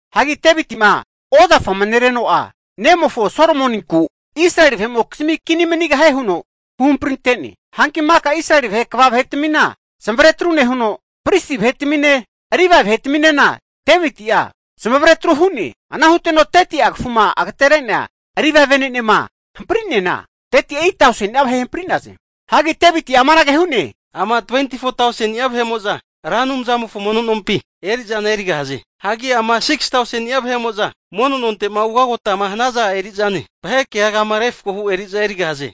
Hagi Deviti'ma ozafama nereno'a, nemofo Solomoninku Israeli vahe'mokizimi kini manigahie huno huhamprinte'ne. Hanki maka Israeli vahe kva vahetamina zamavare atru nehuno, Pristi vahetamine, Livae vahetaminena Deviti'a zamavare atru hu'ne. Ana hutege'za 30'a kafuma agatere'nea Livae vene'nema hampri'nazana 38tauseni'a vahetami hampri'naze. Hagi Deviti'a amanage hu'ne, ama 24tauseni'a vahe'mo'za Ra Anumzamofo mono nompi eri'zana erigahaze. Hagi ama 6tauseni'a vahe'mo'za mono nonte'ma ugagotama hanaza eri'zane, vahe keagama refkohu eri'za erigahaze.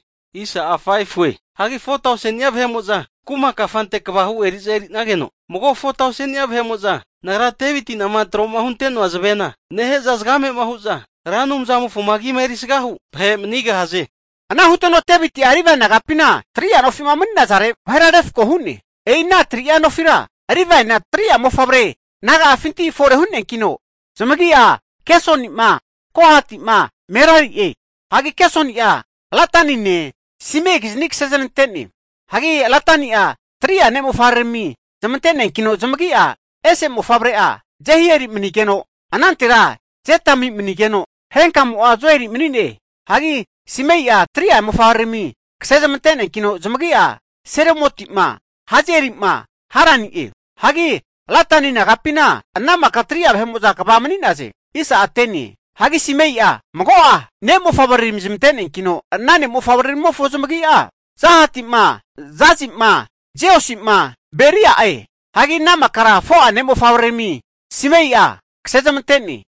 Hagi 4tauseni'a vahe'mo'za kuma kafante kvahu eri'za eri'nageno, mago 4tauseni'a vahe'mo'za Devitina'ma tro'ma hunte'noa zavena nehe'za zagame'ma hu'za Ra Anumzamofoma agima erisgahu vahe manigahaze. Ana huteno Deviti'a Livae nagapina 3'a nofi'ma mani'nazare vahera refko hu'ne. E'i ana 3'a nofira Livaena 3'a mofavre naga'afinti fore hu'nazankino, zamagi'a Gesoni'ma, Kohati'ma, Merari'e. Hagi Gesoni'a Ladanine Simeikizni kasezanante'ne. Hagi Ladani'a 3'a ne' mofavrerami zamante'neankino zamagi'a, ese mofavre'a Jehieli manigeno, anantera Zetami mani'geno henkamo'a Joeli mani'ne. Hagi Semei'a 3'a ne' mofavrerami kasente'neankino zamagi'a, Selomoti'ma, Hazieli'ma, Harani'e. Hagi Ladani nagapina ama ana 3'a vahe'mo'za kva mani'naze. Hagi Simei'a mago'a ne' mofavrerami zmante'neankino, ana ne'mofavreramimofo zamagi'a, Jahati'ma Ziza'ma Jeusi'ma, Beria'e. Hagi ana makara 4'a ne' mofavrerami Simei'a kasezmante'ne.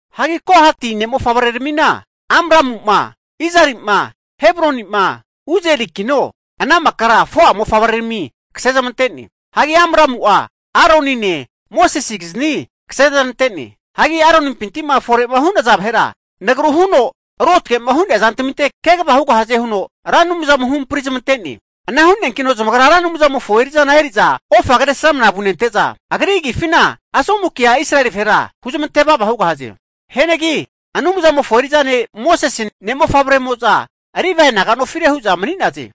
Hagi Kohati ne' mofavreramina, Amramu'ma, Izari'ma, Hebroni'ma, Uzielikino, ana makara 4'a mofavrerami kasezmante'ne. Hagi Amramu'a Aronine Mosesekizni kasezanante'ne. Hagi Aronimpinti'ma fore'ma hu'naza vahera nagru huno ruotge'ma hu'nea zantminte kegava hugahaze huno Ra Anumzamo huhamprizmante'ne. Ana hu'neankino zamagra Ra Anumzamofo eri'zana eri'za ofa kresramna vunente'za, Agri agifina asomu kea Israeli vahera huzmante vava hugahaze. Hianagi Anumzamofo eri'za ne' Mosese ne'mofavre'mo'za Livae naga nofire hu'za mani'naze.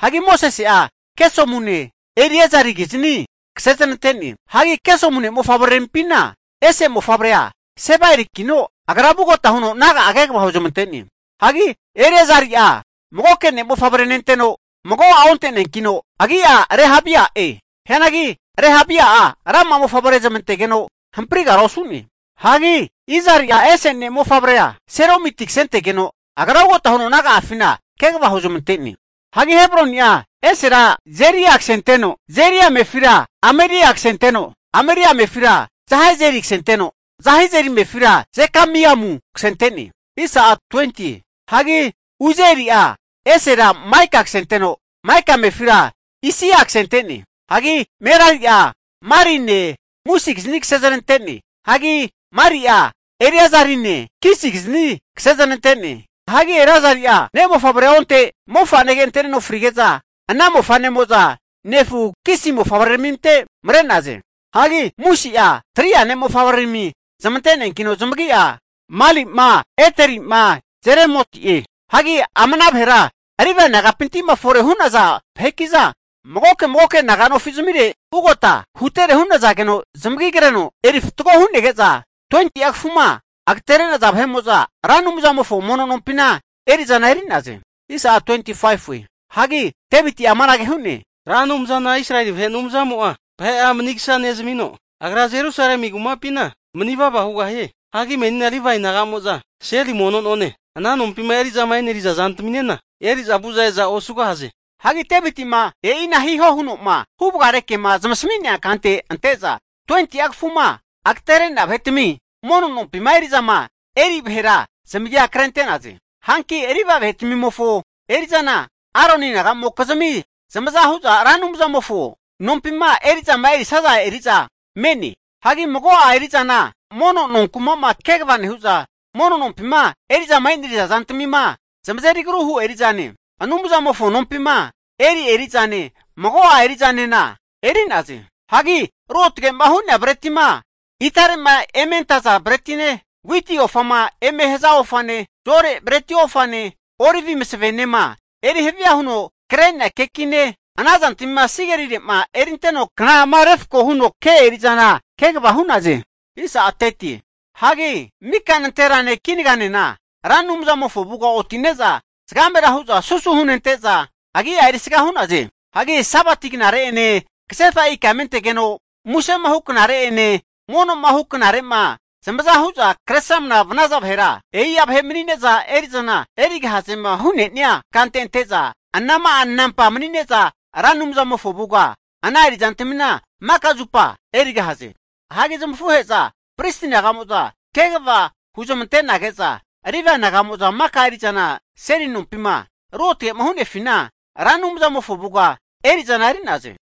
Hagi Mosese'a Gesomune Eliezarikizni kasezanante'ne. Hagi Gesomu ne' mofavreramimpina ese mofavre'a Subaelikino, agra vugota huno naga'a kegava huzmante'ne. Hagi Eliezari'a magoke ne' mofavre nenteno mago'a onte'neankino, agi'a Rehabia'e. Hianagi Rehabia'a rama'a mofavre zamantegeno, hamprigara osu'ne. Hagi Izari'a ese ne' mofavrea Selomiti kasente'geno agra ugota huno naga'afina kegava huzmante'ne. Hagi Hebroni'a esera Jeria kasenteno, Jeria amefira Amaria kasenteno, Amaria amefira Jahazieli kasenteno, Jahazieli amefira Jekamiamu kasente'ne. Hagi Uzieli'a esera Maika kasenteno, Maika amefira Isia kasente'ne. Hagi Merari'a Maline Musikizni kasezanante'ne. Hagi Mali'a Eleazarine Kisikizni kasezanante'ne. Hagi Eleazari'a ne'mofavrea onte mofanege anteneno frige'za, ana mofanemo'za, nefu Kisi mofavreraminte mare'naze. Hagi Musi'a 3'a ne'mofavrerami zmante'neankino zamagi'a, Mali'ma, Ederi'ma, Jeremoti'e. Hagi ama ana vahera Livae nagapinti'ma fore'ma hu'naza vaheki'za, magoke magoke naga nofizmire ugota hutere hu'nazageno zamagi kreno eri fatgo hu'nege'za 20'a kafuma agatere'naza vahe'mo'za Ra Anumzamofo mono nompina eri'zana enerize. Hagi Deviti'a amanage hu'ne, Ra Anumzana Israeli vahe Anumzamo'a vahe'a manigasa nezmino, Agra Jerusalemi kumapina mani vava hugahie. Hagi menina Livae naga'mo'za, Seli mono none ana nompima eri'zama e'neriza zantaminena eri'za vu'za e'za osugahaze. Hagi Deviti'ma e'ina hiho huno'ma huvagare kema zamasami'nea kante ante'za, 20'a kafuma agatere'nea vahetami mono nompima eri'zama eri vahera zamagia krente'naze. Hanki Livae vahe'tmimofo eri'zana, Aroni naga'mokizmi zamaza hu'za Ra Anumzamofo nompima eri'zama erisaza eri'za me'ne. Hagi mago'a eri'zana mono nonkuma'ma kegava nehu'za, mono nompima eri'zama e'neriza zantamima zamazeri agruhu eri'zane, Anumzamofo nompima eri eri'zane, mago'a eri'zanena eri'naze. Hagi ruotgema hu'nea bretima itare'ma eme antaza bretine, witi ofama eme haza ofane, zo'ore breti ofane, olivi masavenema erihavia huno kre'nea kekine, anazantamima sigerirema erinteno kna'ama refko huno ke eri'zane kegava hu'naze. Hagi mika nanterane kinaganena Ra Anumzamofo avuga otine'za zagamera hu'za susu hunente'za, agia erisga hu'naze. Hagi Sabati knare'ene kasefa ika ementegeno musema hu knare'ene mono'ma hu knare'ma zamaza hu'za Kresramana vanaza vahera, e'i'a vahe manine'za eri'zana erigahazema hu'nenia kante ante'za anama'a namba mani'neza, Ra Anumzamofo avuga ana eri'zantamina maka zupa erigahaze. Hagi zamafuhe'za pristi naga'mo'za kegava huzmante'nage'za, Livae naga'mo'za maka eri'zana seli nompima ruotage'ma hu'nefina Ra Anumzamofo avuga eri'zana eri'naze.